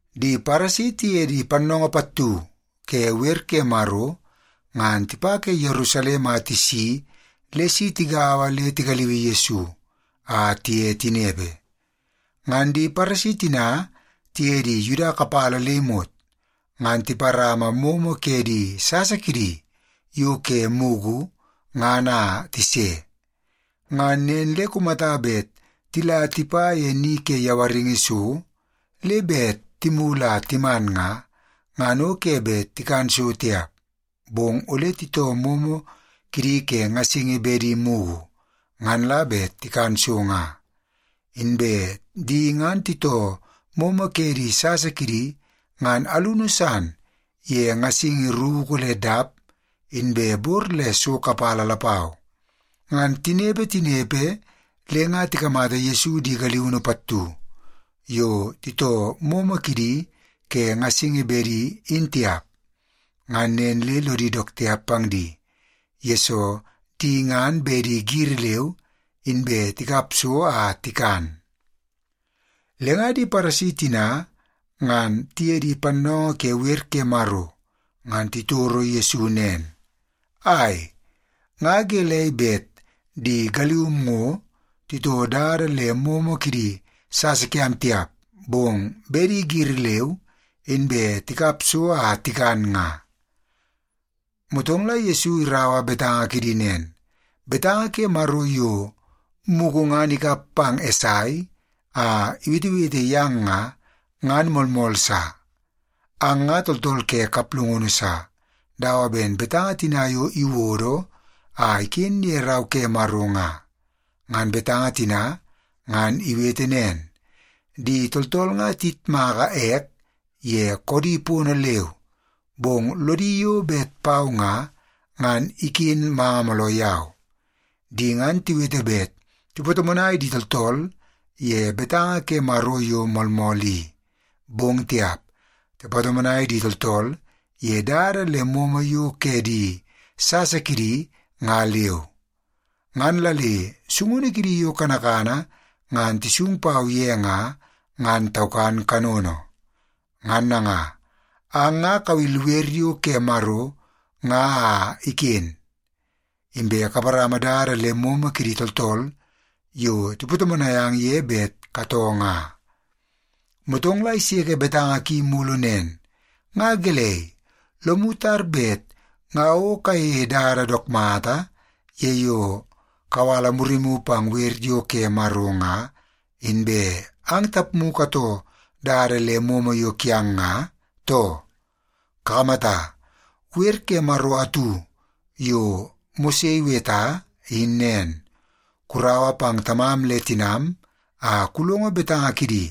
Di Paresi tiye di pannoongoo pattu ke wer ke Maro ngan tipa ke Yerusalem a tisi le si tigaua le tigaliui Yesu a tiye tinepe. Ngan di Paresi tina tiye di Yuda kapala le imot, ngan tiparama momo ke di sasa kidi yo ke mugu ngan a tise. Ngan nen le kumata bet tila tipa ye ni ke yawaringi so le bet timulu a timan nga, ngan o ke bet tikan so tiap, bong ole titoo momo kidi ke ngasingi bedi mugu, ngan la bet tikan so nga. Inbe di ngan titoo momo ke di sasa kidi ngan alunu san ye ngasingi ruku le dap inbe bor le so kapala lapau. Ngan tinepe, tinepe, le nga tikamata Yesu di galiunu pattu yo titoo momo kidi ke ngasingi bedi in tiap. Ngan nen le lodi dook tiap pang di, yesoo di ngan bedi giri leu inbe tikap so a tikan. Le nga di Paresi tina ngan tiye di pannoongoo ke wer ke Maro ngan titoro Yesu nen, “Ai, nga gelei bet di galium ngo titoo dada le momo kidi sasa kiam tiap, bong bedi giri leu inbe tikap so a tikan nga?” Motong la Yesu iraua betanga kidi nen, “Betanga ke Maro yo mugu ngan ikap pang Esai a iwetewete yang nga, ngan moolmool sa. Ang nga tooltool ke kaplungunu sa, dawa ben betanga tina yo iwodo a iken ye Rau ke Maro nga. Ngan betanga tina ngan iwete nen, ‘Di tooltool nga tiyitmaka ek ye koodi pono leu, bong lodi yo bet pau nga, ngan iken manga mooloo yau. Di ngan tiwete bet tipatomonai di tooltool ye betanga ke Maro yo moolmool i, bong tiap, tipatomonai di tooltool ye dada le momo yo ke di sasa kidi nga leu. Ngan la le sungunu kidi yo kanakana ngan tisung pau ye nga, ngan taukan kanono.’ Ngan nanga, ang nga kawil wer yo ke Maro nga a iken, inbe kaparama dada le momo kidi tooltool yo tipatomonai ang ye bet katoo nga.” Motong la iseke betanga ki mulu nen, “Nga gelei, lomu tar bet nga o kayeie dada dook mata ye yo kawala murimu pang wer yo ke Maro nga, inbe ang tapmu la katoo dada le momo yo kiang nga, too? Kakamata, wer ke Maro atu yo Mose iweta in nen, ‘Kuraua pang tamam le tinam a kulongo betanga kidi.’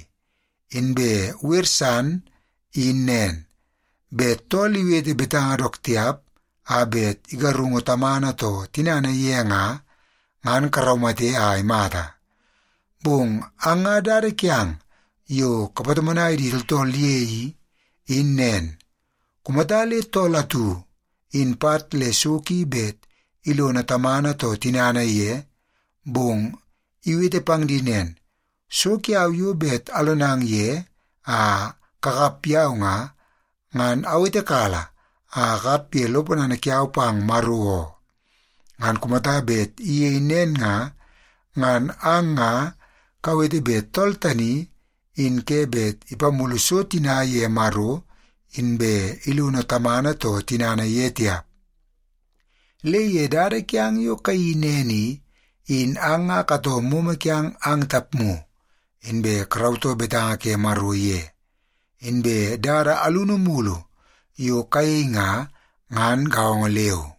Inbe wer san in nen, ‘Bet tool iwete betanga dook tiap a bet igarungu tamana too tinana ye nga, ngan karaumate a imata.’ Bong ang nga dada kiang yo kapatomonai di tooltool ye i, in nen. Kumata le tool atu, in pat le so ki bet ilono tamana too tinana ye, bong iwete pang di nen, ‘So kiau yo bet alonang ye a kakap yau nga, ngan awetekala a akap ye lo ponana kiau pang Maro oo,’ ngan kumata bet iyei nen nga, ngan ang nga kawete bet tool tani in ke bet ipamulu so tina ye Maro inbe ilono tamana too tinana ye tiap. Le ye dada kiang yo kayeii nen i, in ang nga katoo momo kiang ang tapmu, inbe karautoo betanga ke Maro ye. Inbe dada alunu mulu yo kayei nga, ngan gaongo leu.”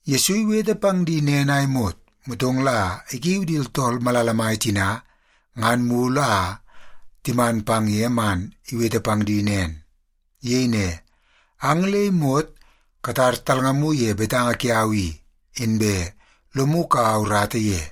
Yesu iwete pang di nen a imot, motong la ikiu di tooltool malala mai tina ngan mulu a timan pang ye man iwete pang di nen. Iyei ne, “Ang le imot katar talngamu ye betanga kiau i, inbe lomu kaua urata ye.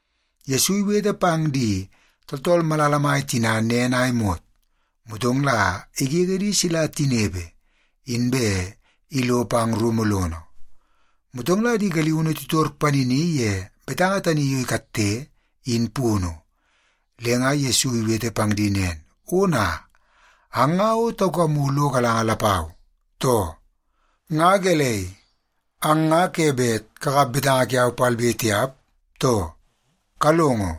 Yesu iwete pang di tooltool malala mai tina nen a imot, motong la igege di sila tinepe, inbe ilo pang rumu lono. Motong la di galiunu titor panini ye betanga tani yo ikatte, in punu. Le nga Yesu iwete pang di nen, “Ona, ang nga o taukamu lo galanga lapau, too? Nga gelei, ang nga ke bet kakap betanga kiau palbe tiap, too? Kalongo,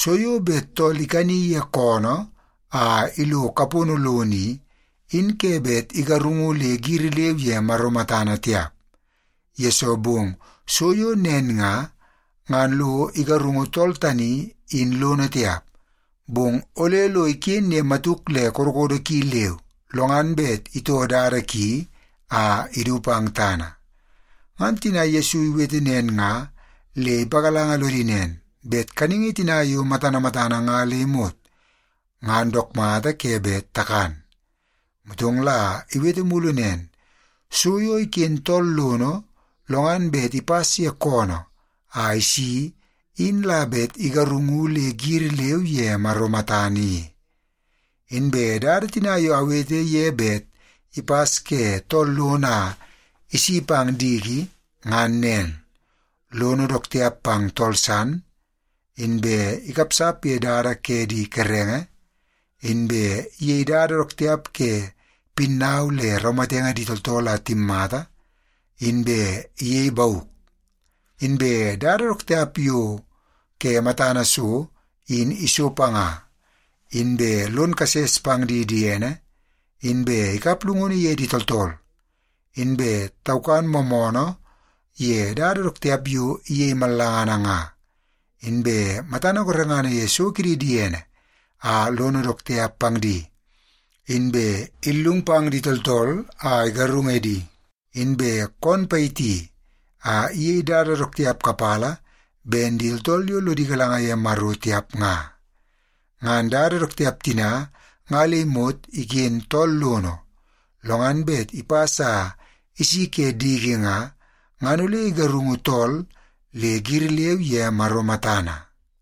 so yo bet tool ikani ye koonoo a ilo kapono lono i, in ke bet igarungu le giri leu ye Maro matana tiap, yesoo bong so yo nen nga, ngan lo igarungu tool tani in lono tiap. Bong ole lo iken ye matuk le kodokodo ki leu, lo ngan bet itoo dada ki a idu pang tana.” Ngan tina Yesu iwete nen nga le ipagalanga lodi nen, bet kaningi tina yo matana matana nga le imot, ngan dook mata ke bet takan. Motong la iwete mulu nen, “So yo iken tool lono, lo ngan bet ipas ye koonoo a isi in la bet igarungu le giri leu ye Maro matana i. Inbe dada tina yo awete ye bet ipas ke tool lono a isi pang diki, ngan nen; lono dook tiap pang tool san, inbe ikapsap ye dada ke di kerenge, inbe iyei dada dook tiap ke pinnau le raumatenge di tooltool a timmata, inbe iyei bauk. Inbe dada dook tiap yo ke matana so in iso panga, inbe lon kases pang di diene, inbe ikap llungunu ye di tooltool, inbe taukan moomoonoo ye dada dook tiap yo iyei mallangana nga, inbe matana gorengana ye so kidi diene a lono dook tiap pang di, inbe illung pang di tooltool a igarung edi, inbe koon payiti a iyei dada dook tiap kapala ben di tooltool yo lodi galanga ye Maro tiap nga. Ngan dada dook tiap tina nga le imot iken tool lono, lo ngan bet ipas a isi ke diki nga, ngan ole igarungu tool le giri leu ye Maro matana.”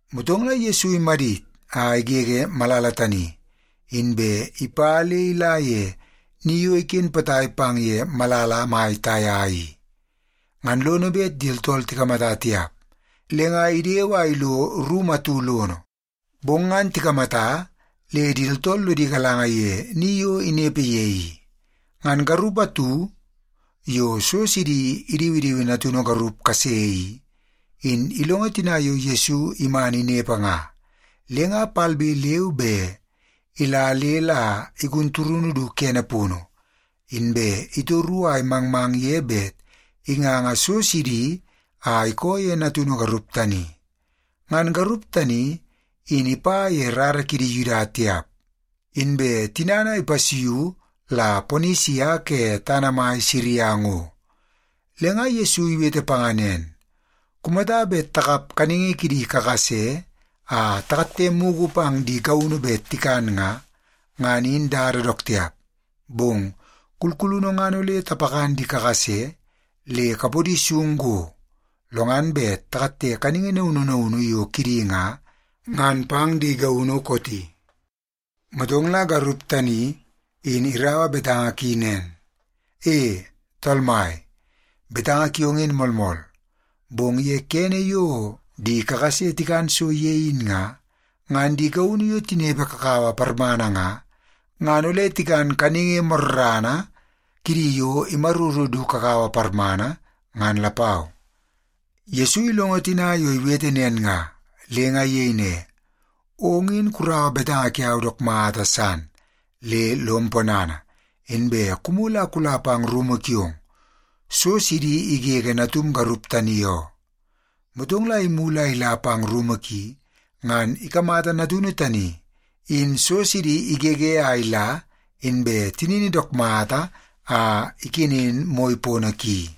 Motong la Yesu imadit a igege malala tani, inbe ipa le ila ye ni yo iken potai pang ye malala mai Taia i. Ngan lono bet di tooltool tikamata tiap, le nga idewe a ilo rumu atu lono. Bong ngan tikamata le di tooltool lodi galanga ye ni yo inepe ye i. Ngan garup atu yo so sidi idiwidiwi natunu garup kase i, in ilongo tina yo Yesu iman inepe nga, le nga palbe leu be ila le la igun turunu du kene punu, inbe itoru a imangmang ye bet inganga so sidi a ikoo ye natunu garup tani. Ngan garup tani in ipa ye rara kidi Yuda tiap, inbe tinana ipasuiu la Ponisia ke tana mai Siria ngo. Le nga Yesu iwete panga nen, “Kumata bet takap kaningi kidi kakase a takatte mugu pang di gaunu bet tikan nga, ngan in dada dook tiap. Bong kulkulunu ngan ole tapakan di kakase le kapodi sung go, lo ngan bet takatte kaningi naunu naunu yo kidi nga, ngan pang di gaunu kooti.” Motong la garup tani in iraua betanga ki nen, “E, Tool Mai, betanga kiong in moolmool. Bong ye kene yo di kakase tikan so ye in nga, ngan di gaunu yo tinepe kakawa parmana nga, ngan ole tikan kaningi morrana kidi yo imaruru du kakawa parmana, ngan lapau.” Yesu ilongo tina yo iwete nen nga, le nga iyei ne, “Ong in kuraua betanga kiau dook mata san, le lom ponana, inbe kumulu a kula pang rumu kiong. So sidi igege natum garup tani oo.” Motong la imulu a ila pang rumu ki, ngan ikamata natunu tani in so sidi igege a ila inbe tinini dook mata a ikenen moi pono ki.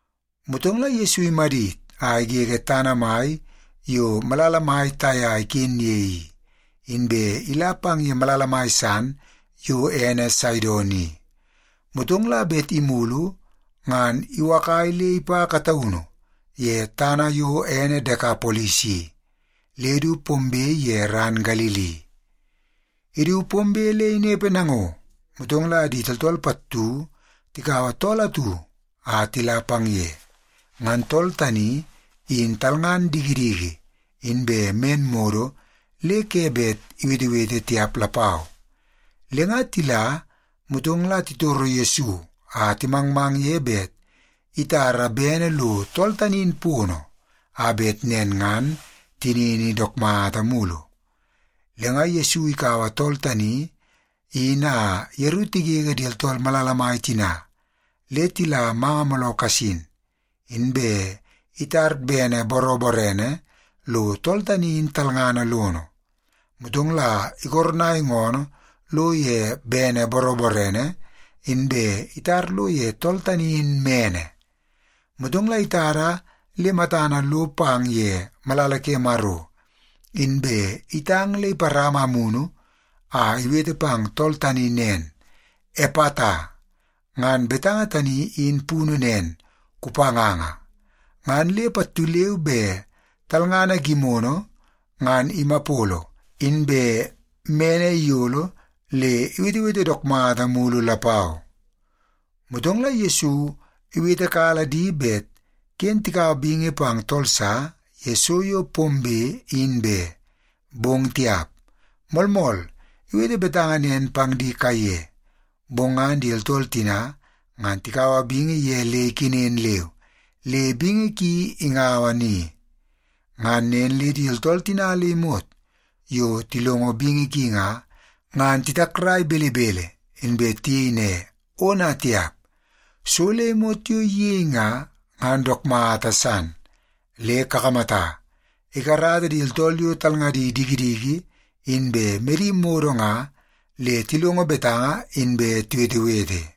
Motong la Yesu imadit a igege tana mai yo malala mai Taia iken ye i, inbe ila pang ye malala mai san yo ene Saidon i, motong la bet imulu ngan iwakai le ipa kataunu ye tana yo ene Dekapolis i, le du pombe ye ran Galili. Idu pombe le inepe nango, motong la di tooltool pattu tikaua tool atu a tila pang ye. Ngan tool tani in talngan dikidiki, inbe men modo le ke bet iwetewete tiap lapau. Le nga tila, motong la titoro Yesu a timangmang ye bet itara bene lo tool tani in pono, a bet nen ngan tinini dook mata mulu. Le nga Yesu ikaua tool tani in a yeru tigege di tooltool malala mai tina le tila manga mooloo kasin, inbe itar bene boroborene lo tool tani in talngana lono. Motong la ikoronai ngoonoo lo ye bene boroborene, inbe itar lo ye tool tani in mene. Motong la itada le matana lo pang ye malala ke Maro, inbe itang le iparama amunu a iwete pang tool tani nen, “Epata!” Ngan betanga tani in punu nen, “Kupanganga!” Ngan le pattu leu be talngana gimono ngan imapolo, inbe mene iyolo le iwetewete dook mata mulu lapau. Motong la Yesu iwetekala di bet ken tikaua bingi pang tool sa ye so yo pombe in be. Bong tiap! Moolmool iwete betanga nen pang di kaiye, bong ngan di tooltool tina ngan tikaua bingi ye le ikenen leu, le bingi ki ingaua ni. Ngan nen le di tooltool tina le imot yo tilongo bingi ki nga, ngan titakrai belebele. Inbe tiyei ne, “Ona tiap! So le imot yo iyei nga, ngan dook mata san. Le kakamata, ikarata di tooltool yo talngadi dikidiki inbe medi modo nga, le tilongo betanga inbe tiwetewete.”